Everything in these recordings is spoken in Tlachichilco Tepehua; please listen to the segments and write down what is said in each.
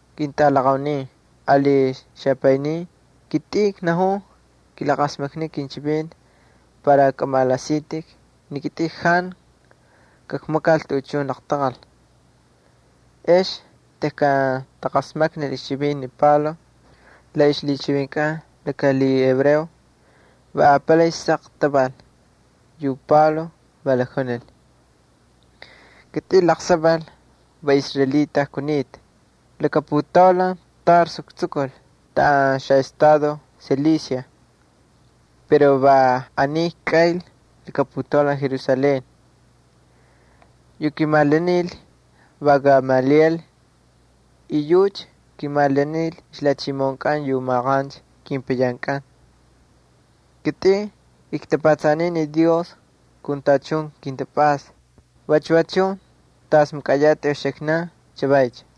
—Ketꞌalaqaunin ali xapaynin, kitꞌin knajun kilaqasmakniu kinchivinti para kꞌamalaꞌasitꞌik ni kitꞌin jantu kakmakal tuꞌuchun laqtaqal. Ex tejkan taqasmaknil ixchivinti ni Pablo la ixlhichivinkꞌan laka lhihebreo, va apalay saq taval. Yu Pablo va lakjunil: —Kitꞌin laqsaval va israelita kunita. Va laka putaulan Tarso ktsukul taꞌan xaꞌestado Cilicia, pero va aniy kꞌaynl laka putaulan Jerusalén. Yu kimalanil va Gamaliel, y yucha kimalanil ixlhachimoꞌonkꞌan yu maqancha kepayankꞌan. Kitꞌin ktapatsaniy ni Dios kun tachun kintapꞌasta vachu chun tacha makꞌayatꞌik uxiknankꞌan chavaycha.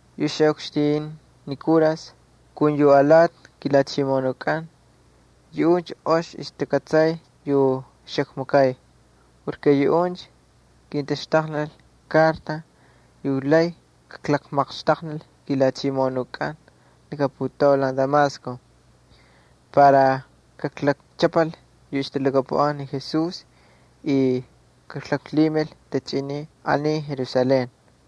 Yu xaꞌukxtin ni kuras kun yu alati kilhachimoꞌonunkꞌan yuꞌuncha ox takꞌatsay yu xakmakay porke yuꞌuncha kintaxtaqnil kartas yu lay kamaqxtaqnil kilhachimoꞌonunkꞌan laka putaulan Damasco, para kaklakchꞌapal yu ixtalhakapuꞌan ni Jesús y kaklaklhimil tachꞌinin aniy Jerusalén.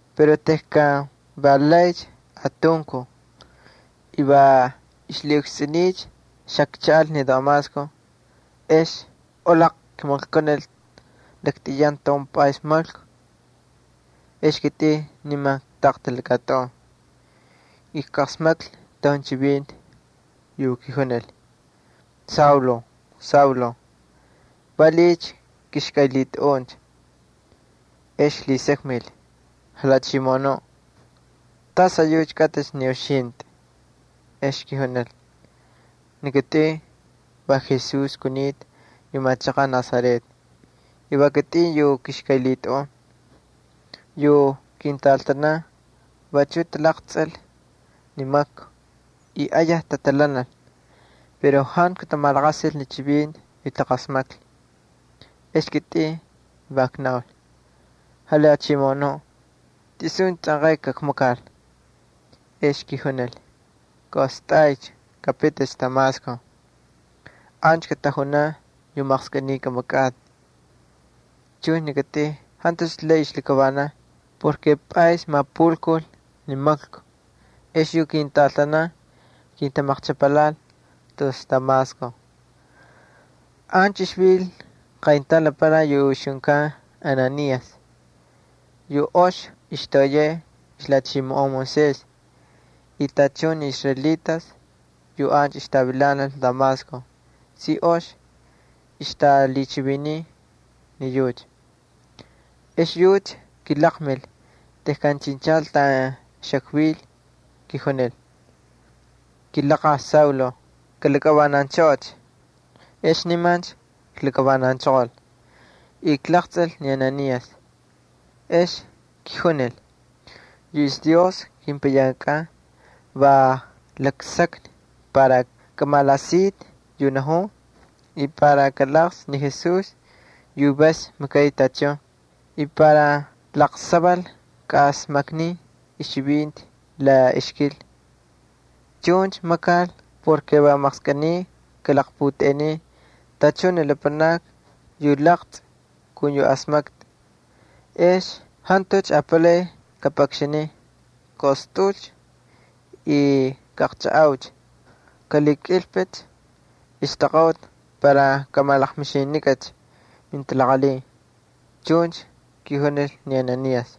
’Pero tejkan va laycha atunkuj, y va ixlhiꞌukstsꞌuniycha xakchaꞌal ni Damasco, ex olaql kimaklkunil laktꞌiyan taun pꞌays maklku. Ex kitꞌin niman ktaqtal laka tꞌun, ijqasmaklhi taun chivinti yu kijunil: “Saulo, Saulo, ¿valiꞌiycha kꞌixkꞌaylhitꞌaꞌuncha?” Ex klhisakmil: “¿Jalhachimoꞌonuꞌ, tas ayucha kꞌatꞌicha ni uxintꞌi?” Ex kijunil: “Ni kitꞌin va Jesús kunita yu machaqaꞌ Nazaret, y va kitꞌin yu kꞌixkꞌaylhitꞌaꞌun.” Yu kintꞌaltanan vachuꞌ talaqtsꞌil ni maklku y ayaj tatalhanal pero jantu katamalaqasil ni chivinti yu taqasmaklhi. Ex kitꞌin va knaul: “Jalhachimoꞌonuꞌ, ¿suncha tsꞌanqay kakmakal?” Ex kijunil: “Kꞌaꞌostꞌaycha, kapiticha Damasco. Ancha katajunan yu maqskꞌiniy kꞌamakꞌatꞌi.” Chuncha ni kitꞌin jantucha lay xaklakavanan porke pꞌays mapulkul ni maklku, ex yu kintꞌaltanan kintamaqchꞌapalhaꞌal tus Damasco. ’Ancha ixvil qayntaun lapanaki yu ixjunkan Ananías yu ox ixtoꞌoyay ixlhachimoꞌon Moisés y tachun ni israelitas yu ancha ixtavilanal Damasco si ox ixtalhichiviniy ni yucha. Exyucha kilaqmil, tejkan chinchal taꞌan xakvil, kijunil: “Kilaqaj Saulo, kalakꞌavananchꞌoꞌocha.” Ex nimancha klakavananchoqol y klaqtsꞌil ni Ananías. Ex kijunil: “Yu ixDios kepayankꞌan va laksakni para kamalaꞌasitꞌi yu najun y para kalaqtsꞌi ni Jesús yu vas makay tachun y para laqsaval kaꞌasmaknin ixchivinti la ixkil. Chuncha makal porke va maqskꞌiniy kꞌalaqputꞌeꞌenin tachun ni lapanakni yu laqtsꞌi kun yu asmaktꞌi. Ex jantucha apalay kapꞌakxanin. Kꞌaꞌostꞌaꞌulcha y kaꞌaqchajꞌaucha, kꞌalhikꞌilpꞌicha ixtaqaꞌuti para kꞌamalaqmixinikꞌacha mintalaqalhin”, chuncha kijunil ni Ananías.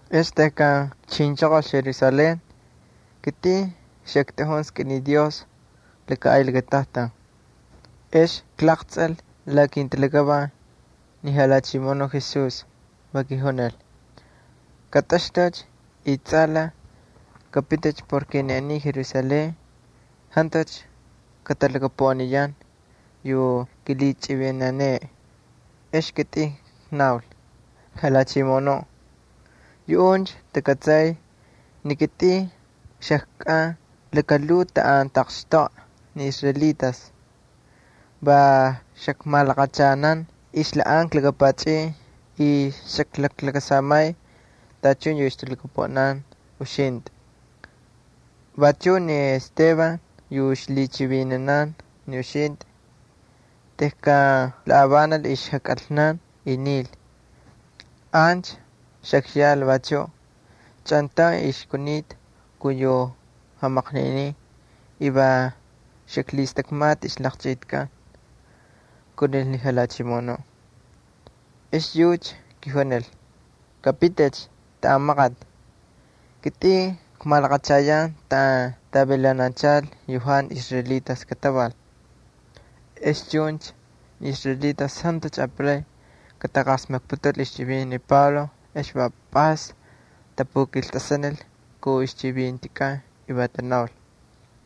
’Ex tejkan kchinchoqol Jerusalén, ni kitꞌin xaktꞌajun skꞌiniꞌ Dios laka ay lakatajtan. Ex klaqtsꞌil la kintalakavan ni Jalhachimoꞌonuꞌ Jesús, va kijunil: “Katꞌaxtꞌu, y tsꞌalaj kꞌapiti porke aniy ni Jerusalén jantu katalhakapuꞌaniyan yu kilhichꞌivinaneꞌe.” Ex kitꞌin knaul: “Jalhachimoꞌonuꞌ, yuꞌuncha takꞌatsay ni kitꞌin xajkꞌan lakalhuu taꞌan tataqxtoꞌa ni israelitas. Va xakmalaqachanan ixlhaꞌanka laka pachꞌin y xaklaklakasamay tachun yu ixtalhakapuꞌanan uxintꞌi. Vachuꞌ ni Esteban yu ixlhichivinanan ni uxintꞌi, tejkan lhavanal ixjakꞌalna y nil, ancha xakyal vachuꞌ chꞌantaun xajkunita kun yu jamaqninin y va xaklhistakmata ixlaqchꞌitikꞌan”, kunil ni Jalhachimoꞌonuꞌ. Ex yucha kijunil: “Kapiticha taꞌan maqati. Kitꞌin kakmalaqachayan taꞌan tavilananchal yu jantu israelitas kataval.” Ex chuncha ni israelitas jantucha apalay kataqasmakniputul ixchivinti ni Pablo. Va pꞌays tapukiltꞌasanil kun ixchivintikꞌan y tanaul: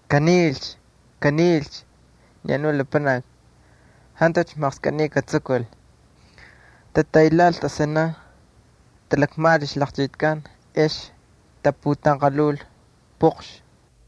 —¡Kanilcha, kanilcha ni anu lapanaki! ¡Jantucha maqskꞌiniy katsukul! Tataylhaꞌal tꞌasanan, talakmajꞌal ixlaqchꞌitikꞌan ex taputanqalhul pꞌoqxni.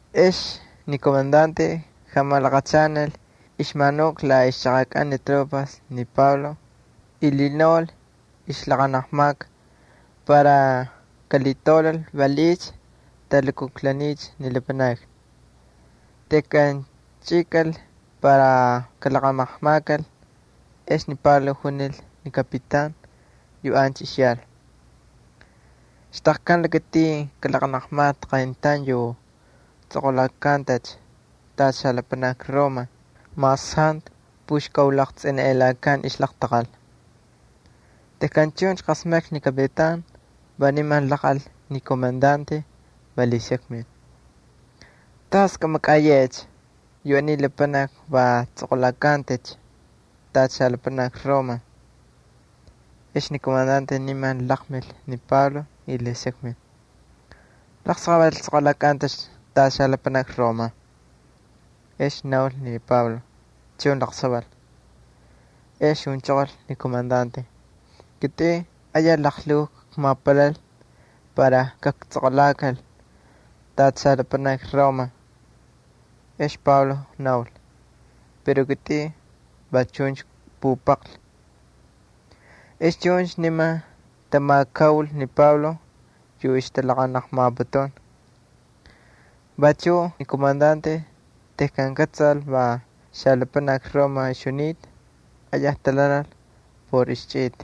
Ex yu komandante jamalaqachanal ixmanuka la ixchaqakꞌan ni tropas ni Pablo y lhinaul ixlaqanaqmaka para kalhitaulal valiꞌiycha talhilukujlaniycha ni lapanakni. Tejkan chꞌikal para kalaqanaqmakal ex ni Pablo junil ni kapitan yu ancha ixyal: —¿Xtaqkan lakatin kꞌalaꞌanaqmatꞌi qayntaun yu tsꞌoqꞌulakantacha tacha xalapanaki Roma mas jantu puxkaulaqtsꞌiniꞌelakan ixlaqtaqal? Tejkan chuncha qasmaklhi ni kapitan va niman laqꞌal ni komandante, va lhisakmil: —¿Tas kamakꞌayeꞌecha? Yu aniy lapanaki va tsꞌoqꞌulakantacha tacha xalapanaki Roma. Ex ni komandante niman laqmil ni Pablo y lhisakmil: —¿Laqsaval tsꞌoqꞌulakꞌantꞌacha tacha xalapanaki Roma? Ex naul ni Pablo: —Chun, laqsaval. Ex junchoqol ni komandante: —Kitꞌin ayaj laqlhuu ikmapalal para kaktsꞌoqꞌulakal tacha xalapanaki Roma. Ex Pablo naul: —Pero kitꞌin va chuncha kpupaqlhi. Ex chuncha nimancha tamakaul ni Pablo yu ixtalaqanaqmaputun. Vachuꞌ ni komandante tejkan kꞌatsal va xalapanaki Roma ixjunita, ayaj talhanal por ixchꞌita.